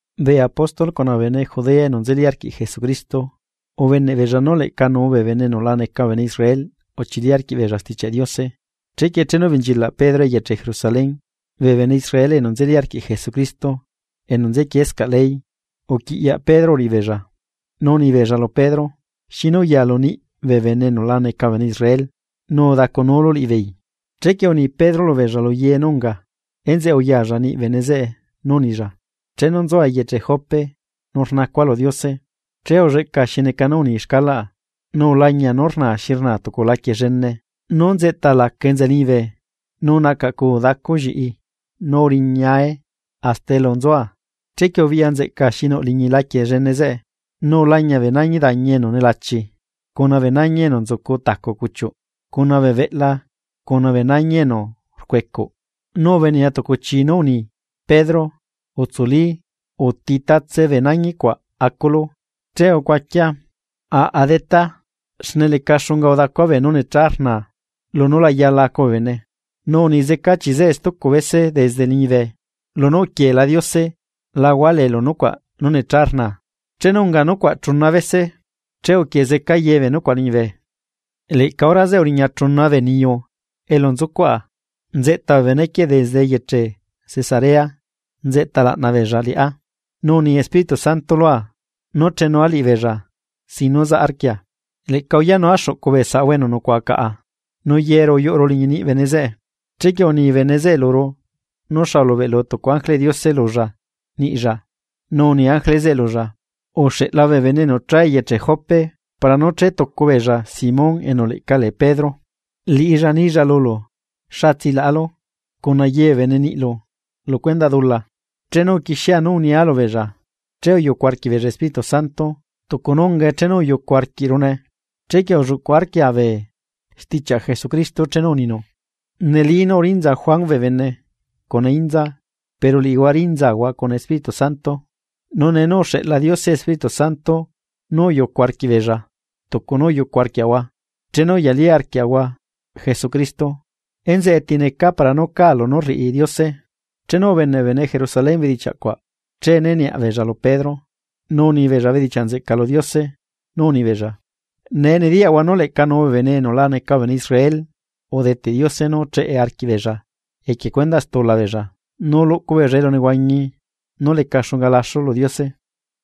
Bee apóstol cuna bee bene Judea enu nzeli arquiꞌ Jesucristo, ubeneꞌbeella nú leꞌca nuu bee bene enu la neca bee bene Israel uchili arquiꞌbeella Stichiaꞌ Diose. Chequie chenu ubenchilaꞌ Pedro eyeche Jerusalén, bee bene Israel enu nzeli arquiꞌ Jesucristo enu nzequiescaꞌ ley, uquiꞌyaꞌ Pedro uriꞌibeella. Nu unibeella lu Pedro: ―¿Xinu uyalu niꞌ bee bene enu la neca bee bene Israel, nu udacunulu liꞌibeei? Chequie uni Pedro lubeella lu ye nú unga, enzeꞌe uyalla niꞌ bene zeꞌe, nu unilla: ―Chenu nzua eyeche Jope, nu rnacua lu Diose, che ulleꞌca xi neca nú uni xcalaꞌa, nu ulañia nú rnaa xi rnaa tucu laquie llene, nú nzeꞌta laca enza liñibe nu nacaꞌcuu dacu lliꞌi nu uriñae hasta elu nzua. Chequie ubiꞌya nzeꞌca xi nuꞌ liñi laquie llene zeꞌe, nu ulañia bee nañi dañi enu nelachi, cuna bee nañi enu nzucu tacu cuchiuꞌ, cuna bee beꞌla cuna bee nañi enu rcuecuꞌ. Nu ubenea tucu chii nú uni: “Pedro, utsuli, uti tatse bee nañi cuaꞌ aculu.” Che ucuaquia: “Aꞌa, Detá, xne leca xunga udacua beenú necha rnaa lunú la yala acu bee bene.” Nu uni zeca chii zeꞌe lua stucu bese desde liñibe: “Lunú uquieela Diose la hualeelu nucuaꞌ nú necha rnaa.” Chenu unga nucuaꞌ chuna bese, che uquie zeca ye bee nucuaꞌ liñibe. Leꞌca hora zeꞌe uriña chuna bee niyu elu nzucuaꞌa, nzeꞌta bee bene quieꞌ desde eyeche Cesarea nzeꞌta laꞌna beella liꞌá. Nu uni Espíritu Santo lua nú chenua liꞌibeella sin nú zaꞌ arquia. Leꞌca uyaꞌnua xuꞌcu bee saꞌahua enu nucuaꞌa caꞌa. Nu yeru uyuꞌuru liñi niꞌi bene zeꞌe, chequie uni bene zeꞌe luru nú xa ulubeꞌlu tucu ángeleꞌ Diose lulla niꞌlla, nu uni ángele zeꞌe lulla: “Uxeꞌla bee bene enu cha eyeche Jope para nú chetucu beella Simón enu leꞌca lee Pedro, liꞌilla nilla lulu xa tsilaꞌalu, cuna ye bee bene niꞌlu lu stula beella.” Chenu uquixia nú unia lubeella, che uyucu arquiꞌbeella Espíritu Santo, tucu nú ungae chenu uyucu arquiꞌrune. Chequie ulluꞌcuꞌ arquia bee stichiaꞌ Jesucristo chenu uninu: “Neli nú urinza Juan bee bene cuna inza, pero liꞌihua rinzahua cuna Espíritu Santo.” Nu nee nú uxeꞌla Diose Espíritu Santo nú uyucu arquiꞌ beella tucu nú uyucu arquiaꞌahua chenu uyalí arquiaꞌahua Jesucristo, ¿enzeꞌe ti necaa para nú cáa lunú rriꞌi Diose? Chenu ubeneꞌ bee bene Jerusalén bedichiaꞌ cuaꞌ, che né niaꞌ beella lu Pedro, nu unibeella bedichiaꞌ nzeꞌca lu Diose, nú unibeella: ―¡Nee nediyaꞌahua nú leꞌca nuu bee bene enu la neca bee bene Israel udeteꞌ Diose nú cheꞌe arquiꞌbeella equie cuendaꞌ stula beella nu luꞌcu beella elunehuañi nú leca xunga laxu lu Diose!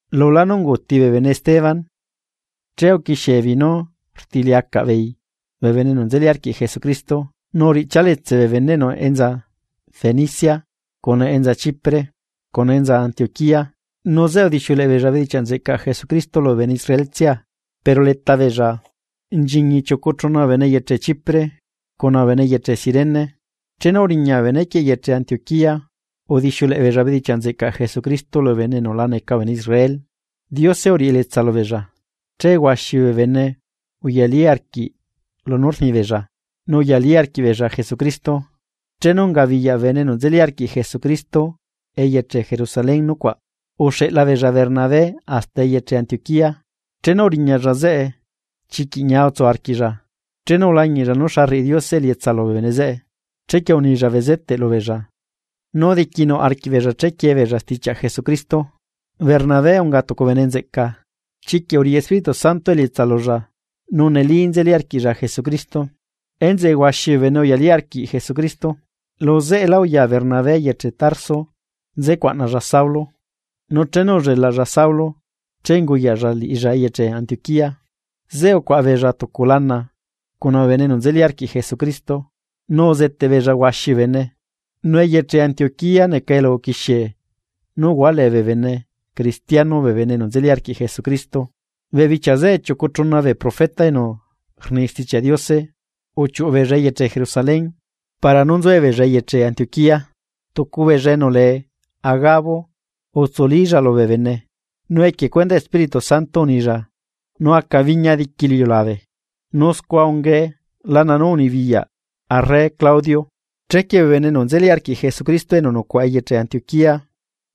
Lulá nú unguuti bee bene Esteban, che uquixiebeei nú rtiliacaꞌ beei bee bene enu nzeli arquiꞌ Jesucristo, nu uriꞌchia letse bee beneꞌnu enza Fenicia, cuna enza Chipre cuna enza Antioquía. Nu zeꞌe udixiuleꞌe beella bedichiaꞌ nzeꞌcaꞌ Jesucristo lubee bene Israel tsia. Pero leta beella nchiñi chiucu chuna bee bene eyeche Chipre cuna bene eyeche Cirene, chenu uriña bee benequieꞌ eyeche Antioquía udixiuleꞌe beella bedichiaꞌ nzeꞌcaꞌ Jesucristo lubee bene enu la neca bee bene Israel. Diose uriꞌi elietsa lubeella, che huaxi bee bene uyalí arquiꞌ lunú rnibeella, nu uyalí arquiꞌbeella Jesucristo. Chenu ungabiyaꞌ bee bene enu nzeli arquiꞌ Jesucristo eyeche Jerusalén nucuaꞌ, uxeꞌla beella Bernabé hasta eyeche Antioquía. Chenu uriñalla zeꞌe, chiquiꞌ ñia utsu arquiꞌlla chenu ulañiꞌlla nú xa rriꞌi Diose elietsa lubee bene zeꞌe. Chequie unilla bezeteꞌ lubeella nu diquinuꞌ arquiꞌbeella chequiee beella stichiaꞌ Jesucristo. Bernabé unga tucu bene nzeꞌca, chiquiꞌ uriꞌi Espíritu Santo elietsa lulla nu neli nzeli arquiꞌlla Jesucristo. Enzeꞌe huaxi bee bene uyalí arquiꞌ Jesucristo. Lu zeꞌelá uya Bernabé eyeche Tarso nzecuaꞌnalla Saulo, nu chenu ullelaꞌlla Saulo che unguyaꞌlla liꞌilla eyeche Antioquía. Zeꞌe ucuaꞌa beella tucu lana cuna bee bene enu nzeli arquiꞌ Jesucristo, nu uzeteꞌ beella huaxi bee bene. Nu eyeche Antioquía neca elu uquixie nú uhualee bee bene cristiano bee bene enu nzeli arquiꞌ Jesucristo. Bee bichia zeꞌe chiucu chuna bee profeta enu rni Stichiaꞌ Diose uchiuꞌu beella eyeche Jerusalén para nú nzuebeella eyeche Antioquía. Tucu beella enu lee Agabo, utsulílla lubee bene, nu equie cuendaꞌ Espíritu Santo unilla nú aca biña diqui lu iliulabe, nu scua ungae lana nú unibiyaꞌ arre Claudio. Chequie bee bene enu nzeli arquiꞌ Jesucristo enu nucuaꞌa eyeche Antioquía,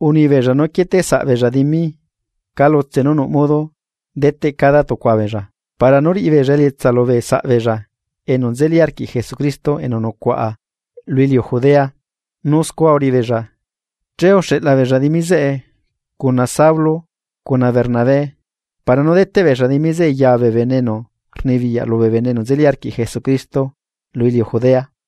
unibeella nú quieteꞌsaꞌbeella dimi calutse nú nuꞌ modo deteꞌ cada tucua beella para nú riꞌi beella elietsa lubee saꞌbeella enu nzeli arquiꞌ Jesucristo enu nucuaꞌa lu iliu Judea. Nu scua uriꞌibeella, che uxeꞌla beella dimi zeꞌe cuna Saulo cuna Bernabé para nú deteꞌ beella dimi zeꞌe ya bee bene enu rnibiyaꞌ lubee bene enu nzeli arquiꞌ Jesucristo, lu iliu Judea.